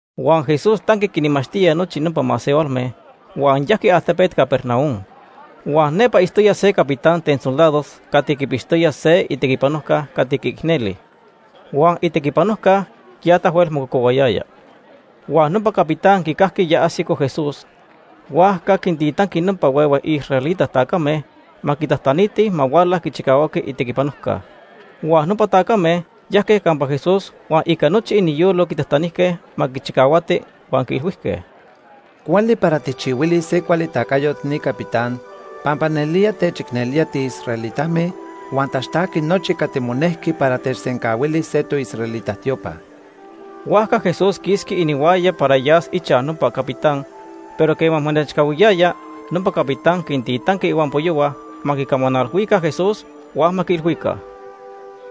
Huan Jesús tanqui quinmachtía nochi nopa masehualme, huan yajqui altepet Capernaum. Huan nepa itztoya se capitán ten soldados cati quipixtoya se itequipanojca cati quiicneli, huan itequipanojca ya tahuel mococohuayaya. Huan nopa capitán quicajqui ya ajsico Jesús, huajca quintitanqui nopa huehue israelita tacame ma quitajtanitij ma huala quichicahuaqui itequipanojca. Huan nopa tacame yajque campa Jesús huan ica nochi iniyolo quitajtanijque ma quichicahuati huan quiilhuijque: ―Cuali para tijchihuilis se cuali tacayot ni capitán, pampa nelía techicnelía tiisraelitame huan taxtajqui nochi cati monejqui para techsencahuili se toisraelita tiopa. Huajca Jesús quisqui inihuaya para yas ichaj nopa capitán, pero quema monechcahuiyaya, nopa capitán quintitanqui ihuampoyohua ma quicamanalhuica Jesús huan ma quiilhuica: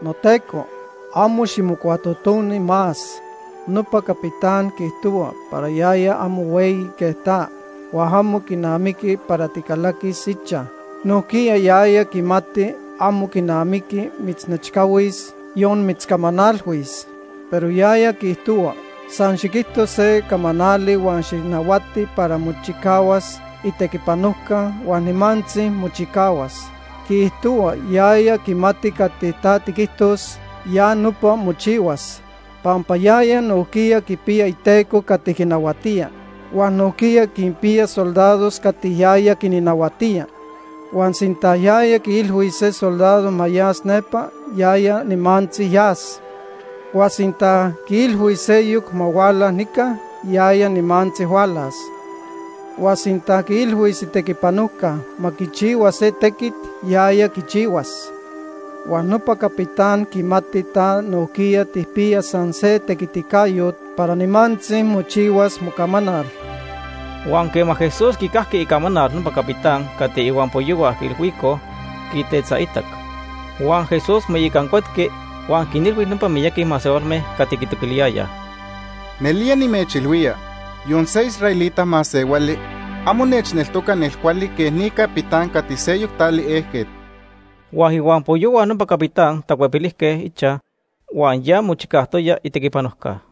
―NoTeco, amo ximocuatotoni más. Nopa capitán quiijtohua para yaya amo hueyi quej ta, huan amo quinamiqui para ticalaquis ichaj. Nojquiya yaya quimati amo quinamiqui mitznechcahuis, yon mitzcamanalhuis. Pero yaya quiijtohua, san xiquijto se camanali huan xijnahuati para mochicahuas itequipanojca huan nimantzi mochicahuas. Quiijtohua yaya quimati cati ta tiquijtos, ya nopa mochihuas, pampa yaya nojquiya quipiya iteco cati quinahuatía. Huan nojquiya quinpiya soldados cati yaya quinnahuatía. Huan sinta yaya quiilhuis se soldado ma yas nepa, yaya nimantzi yas. Huan sinta quiilhuis seyoc ma huala nica, yaya nimantzi hualas. Huan sinta quiilhuis itequipanojca ma quichihua se tequit, yaya quichihuas. Huan nopa capitán quimati ta nojquiya tijpiya san se tequiticayot para nimantzi mochihuas mocamanal. Huan quema Jesús quicajqui icamanal nopa capitán cati ihuampoyohua quiilhuicoj, quitetzaitac. Huan Jesús moicancuetqui huan quinilhui nopa miyaqui masehualme cati quitoquiliyayaj: ―Nelía nimechilhuía, yon se israelita masehuali amo nechneltoca nelcuali quej ni capitán cati seyoc tali ejquet. Huan ihuampoyohua nopa capitán tacuepilijque ichaj, huan ya mochicajtoya itequipanojca.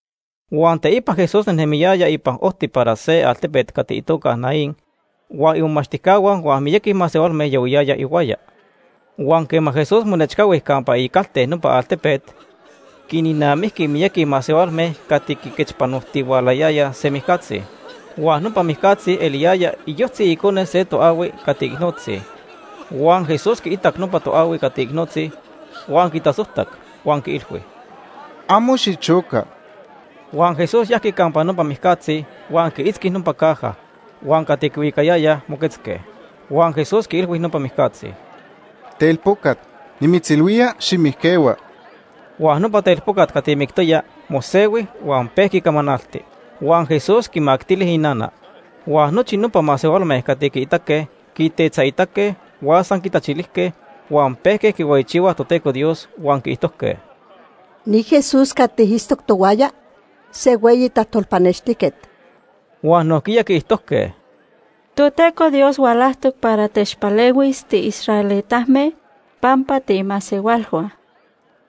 Huan teipa Jesús nejnemiyaya ipan ojti para se altepet cati itoca Naín huan imomachtijcahua huan miyaqui masehualme yahuiyayaj ihuaya. Huan quema Jesús monechcahui campa icalte nopa altepet, quinnamijqui miyaqui masehualme cati quiquechpanojtihualayayaj se mijcatzi. Huan nopa mijcatzi eliyaya iyojtzi icone se toahui cati icnotzi. Huan Jesús quiitac nopa toahui cati icnotzi, huan quitasojtac, huan quiilhui: ―Amo xichoca. Huan Jesús yajqui campa nopa mijcatzi huan quiitzqui nopa caja, huan cati quihuicayayaj moquetzque. Huan Jesús quiilhui nopa mijcatzi: ―Telpocat, nimitzilhuía, ximijquehua. Huan nopa telpocat cati mictoya mosehui huan pejqui camanalti. Huan Jesús quimactili inana. Huan nochi nopa masehualme cati quiitaque quitetzaitzque huan san quitachilijque huan pejque quihueyichihuaj Toteco Dios, huan quiijtojque: ―Ni Jesús cati itztoc tohuaya, se hueyi tajtolpanextijquet. Huan nojquiya quiijtojque: ―Toteco Dios hualajtoc para techpalehuis tiisraelitame pampa tiimasehualhua.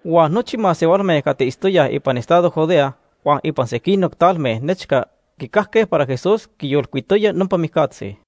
Huan nochi masehualme cati itztoyaj ipan estado Judea huan ipan sequinoc talme nechca quicajque para Jesús quiyolcuitoya nopa mijcatzi.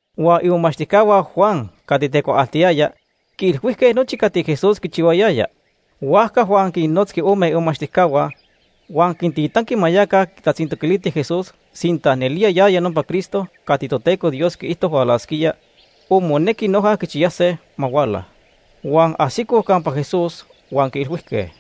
Huan imomachtijcahua Juan cati tecuaaltiyaya quiilhuijque nochi cati Jesús quichihuayaya. Huajca Juan quinnotzqui ome imomachtijcahua, huan quintitanqui ma yaca quitatzintoquilitij Jesús sinta nelía yaya nopa Cristo cati Toteco Dios quiijto hualasquía, o monequi noja quichiyase ma huala. Huan ajsicoj campa Jesús, huan quiilhuijque: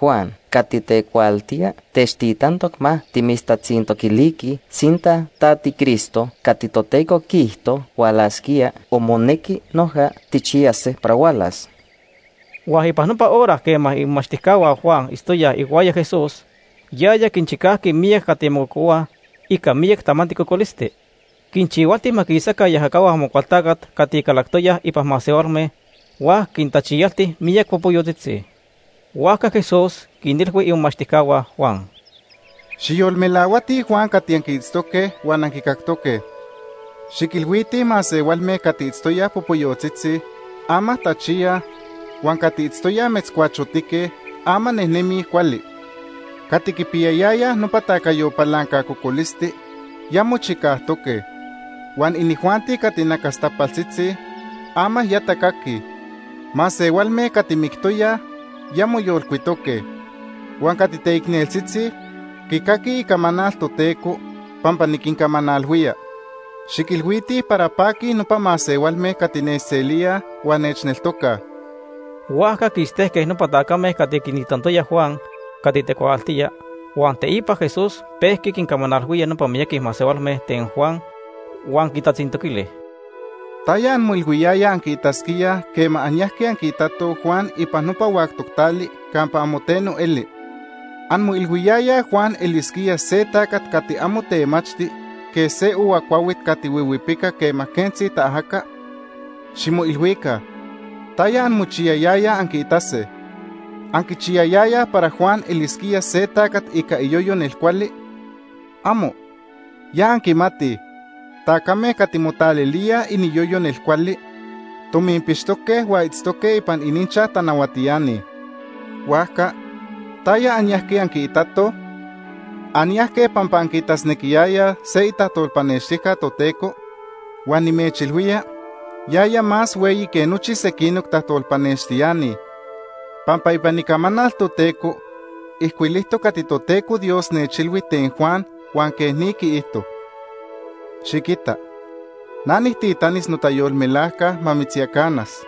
―Juan cati tecuaaltía techtitantoc ma timitztatzintoquiliquij sinta ta tiCristo cati Toteco quiijto hualasquía o monequi noja tijchiyase para hualas. Huan ipan nopa hora quema imomachtijcahua Juan itztoyaj ihuaya Jesús, yaya quinchicajqui miyac cati mococohuaj ica miyac tamanti cocolisti. Quinchihualti ma quisaca iajacahua Amocualtacat cati calactoyaj ipan masehualme huan quintachiyalti miyac popoyotzitzi. Huajca Jesús quinilhui imomachtijcahua Juan: ―Xijyolmelahuatij Juan cati anquiitztoque huan anquicactoque. Xiquilhuitij masehualme cati itztoyaj popoyotzitzi, ama tachiyaj, huan cati itztoyaj metzcuachotique, ama nejnemij cuali. Cati quipiyayayaj nopa tacayo palanca cocolisti, ya mochicajtoque, huan inijuanti cati nacastapaltzitzi, ama ya tacaquij. Masehualme cati mictoyaj ya moyolcuitoque, huan cati teicneltzitzi quicaquij icamanal Toteco, pampa niquincamanalhuía. Xiquilhuitij para paquij nopa masehualme cati nechselíaj huan nechneltocaj. Huajca quistejque nopa tacame cati quintitantoya Juan cati tecuaaltía, huan teipa Jesús pejqui quincamanalhuía nopa miyaqui masehualme ten Juan, huan quintatzintoquili: “¿Taya anmoilhuiyayaj anquiitasquíaj quema anyajque anquiitatoj Juan ipan nopa huactoc tali campa amo teno eli? ¿Anmoilhuiyayaj Juan elisquía se tacat cati amo temachti quej se ohua cuahuit cati huihuipica quema quentzi taajaca? ¡Ximoilhuica! ¿Taya anmochiyayayaj anquiitase? ¿Anquichiyayayaj para Juan elisquía se tacat ica iyoyo nelcuali? Amo. Ya anquimatij tacame cati motalilíaj iniyoyo nelcuali, tominpixtoque huan itztoque ipan ininchaj tanahuatiani. Huajca, ¿taya anyajque anquiitatoj? ¿Anyajque pampa anquiitasnequiyayaj se itajtolpanextijca Toteco? Huan nimechilhuía yaya más hueyi que nochi sequinoc tajtolpanextiani pampa ipan Icamanal Toteco ijcuilijtoc cati Toteco Dios nechilhui ten Juan huan quej ni quiijto: ‘Xiquita, na nijtitanis notayolmelajca ma mitzyacanas.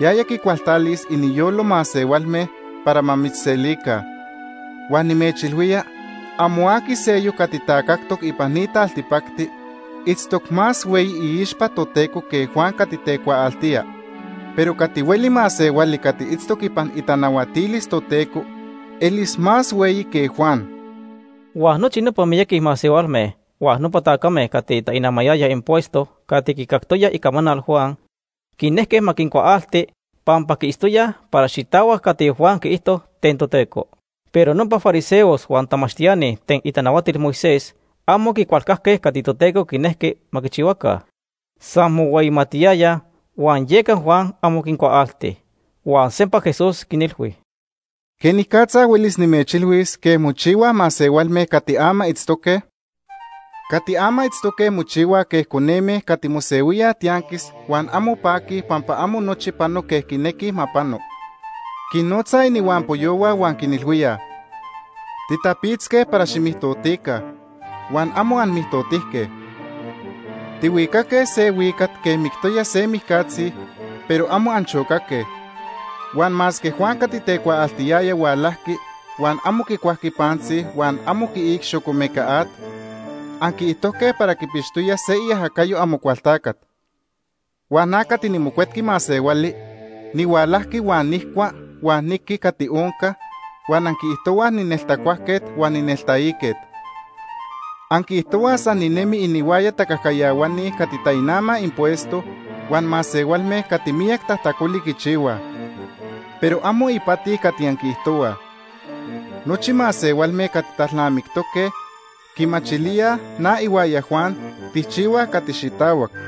Yaya quicualtalis iniyolo masehualme para ma mitzselica.’ Huan nimechilhuía amo aqui seyoc cati tacajtoc ipan ni taltipacti itztoc más hueyi iixpa Toteco que Juan cati tecuaaltía, pero cati hueli masehuali cati itztoc ipan itanahuatilis Toteco elis más hueyi que Juan.” Huan nochi nopa miyaqui masehualme huan nopa tacame cati tainamayayaj impuesto cati quicactoyaj icamanal Juan, quinejque ma quincuaalti, pampa quiitztoyaj para xitahuac cati Juan quiijto ten Toteco. Pero nopa fariseos huan tamachtiani ten itanahuatil Moisés amo quicualcajque cati Toteco quinejqui ma quichihuaca. San mohueyimatiyayaj, huan yeca Juan amo quincuaalti. Huan sempa Jesús quinilhui: “¿Quenicatza huelis nimechilhuis quej mochihuaj masehualme cati ama itztoque? Cati ama itztoque mochihuaj quej coneme cati mosehuíaj tianquis huan amo paquij pampa amo nochi pano quej quinequij ma pano. Quinnotzaj inihuampoyohua huan quinilhuíaj: ‘Titapitzque para ximijtotica, huan amo anmijtotijque. Tihuicaque se huicat quej mictoya se mijcatzi, pero amo anchocaque.’ Huan masque Juan cati tecuaaltiyaya hualajqui huan amo quicuajqui pantzi huan amo quiic xocomeca at, anquiijtojque para quipixtoya se iajacayo Amocualtacat. Huan na cati niMocuetqui Masehuali nihualajqui huan nijcua huan niqui cati onca, huan anquiijtohuaj nineltacuajquet huan nineltaiquet. Anquiijtohuaj san ninemi inihuaya tacajcayahuani cati tainamaj impuesto huan masehualme cati miyac tajtacoli quichihuaj. Pero amo ipati cati anquiijtohuaj. Nochi masehualme cati talnamictoque quimachilíaj na ihuaya Juan tijchihuaj cati xitahuac.”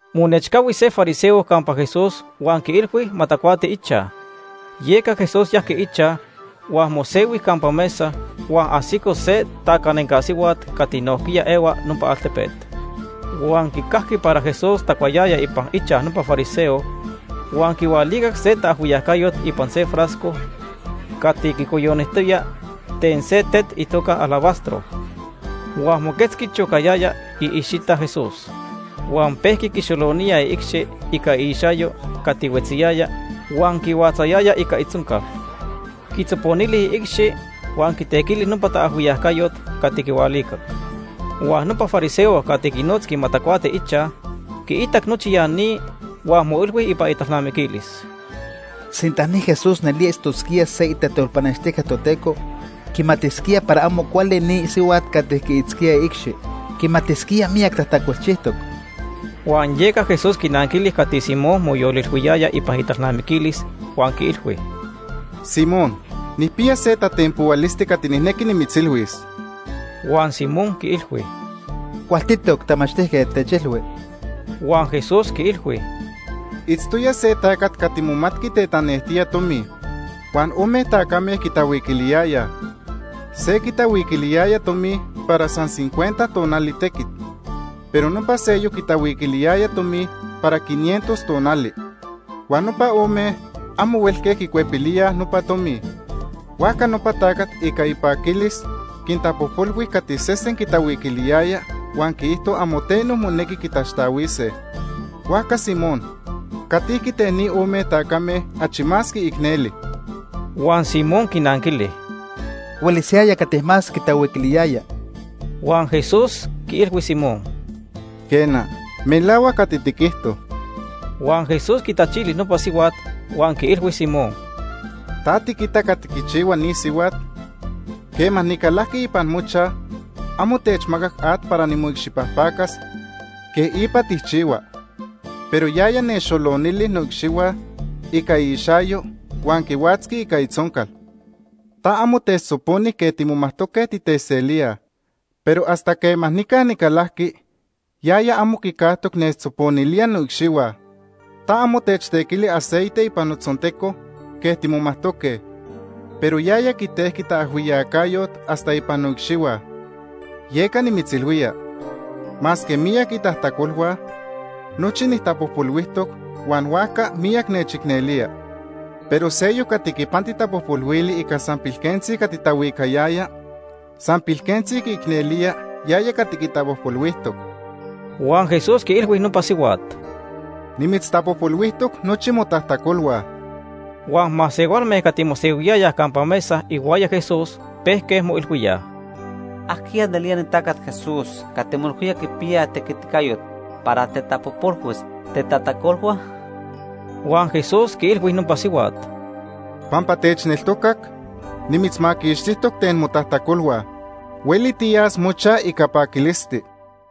Monechcahui se fariseo campa Jesús huan quiilhui ma tacuati ichaj. Yeca Jesús yajqui ichaj huan mosehui campa mesa, huan ajsico se tacanenca sihuat cati nojquiya ehua nopa altepet. Huan quicajqui para Jesús tacuayaya ipan ichaj nopa fariseo huan quihualicac se taajhuiyacayot ipan se frasco cati quicoyonijtoya ten se tet itoca alabastro. Huan moquetzqui chocayaya iicxita Jesús. Huan pejqui quixolonía iicxi ica iixayo cati huetziyaya huan quihuatzayaya ica itzoncal. Quitzoponili iicxi huan quitequili nopa taajhuiyacayot cati quihualicac. Huan nopa fariseo cati quinotzqui ma tacuati ichaj quiitac nochi ya ni, huan moilhui ipan italnamiquilis: “Sinta ni Jesús nelía itztosquía se itajtolpanextijca Toteco, quimatisquía para amo cuali ni sihuat cati quiitzquía iicxi. Quimatisquía miyac tajtacolchijtoc.” Huan yeca Jesús quinanquili cati Simón moyolilhuiyaya ipan italnamiquilis huan quiilhui: ―Simón, nijpiya se tatenpohualisti cati nijnequi nimitzilhuis. Huan Simón quiilhui: ―Cualtitoc, Tamachtijquet, techilhui. Huan Jesús quiilhui: ―Itztoya se tacat cati momatqui tetanejtía tomi. Huan ome tacame quitahuiquiliyayaj. Se quitahuiquiliyaya tomi para san cincuenta tonali tequit, pero nopa seyoc quitahuiquiliyaya tomi para quinientos tonali. Huan nopa ome amo huelque quicuepilíaj nopa tomi. Huajca nopa tacat ica ipaquilis quintapojpolhui cati sesen quitahuiquiliyaya huan quiijto amo teno monequi quitaxtahuise. Huajca Simón, ¿catijqui ten ni ome tacame achi más quiicneli? Huan Simón quinanquili: ―Huelis yaya cati más quitahuiquiliyaya. Huan Jesús quiilhui Simón: ―Quena, melahuac cati tiquijto. Huan Jesús quitachili nopa sihuat huan quiilhui Simón: ―¿Ta tiquita cati quichihua ni sihuat? Quema nicalajqui ipan mochaj, amo techmacac at para nimoicxipajpacas quej ipa tijchihuaj, pero yaya nechxolonili noicxihua ica iixayo huan quihuatzqui ica itzoncal. Ta amo techtzoponi quej timomajtoque titeselíaj, pero hasta quema nica nicalajqui, yaya amo quicajtoc nechtzoponilía noicxihua. Ta amo techtequili aceite ipan notzonteco quej timomajtoque, pero yaya quitejqui taajhuiyacayot hasta ipan noicxihua. Yeca nimitzilhuía, masque miyac itajtacolhua, nochi nijtapojpolhuijtoc huan huajca miyac nechicnelía. Pero seyoc cati quipanti tapojpolhuili ica san pilquentzi cati tahuicayaya, san pilquentzi quiicnelía yaya cati quitapojpolhuijtoc. Huan Jesús quiilhui nopa sihuat: ―Nimitztapojpolhuijtoc nochi motajtacolhua. Huan masehualme cati mosehuiyayaj campa mesa ihuaya Jesús pejque moilhuíaj: ―¿Ajquiya nelía ni tacat Jesús cati moilhuía quipiya tequiticayot para tetapojpolhuis tetajtacolhua? Huan Jesús quiilhui nopa sihuat: ―Pampa techneltocac, nimitzmaquixtijtoc ten motajtacolhua. Hueli tiyas mochaj ica paquilisti.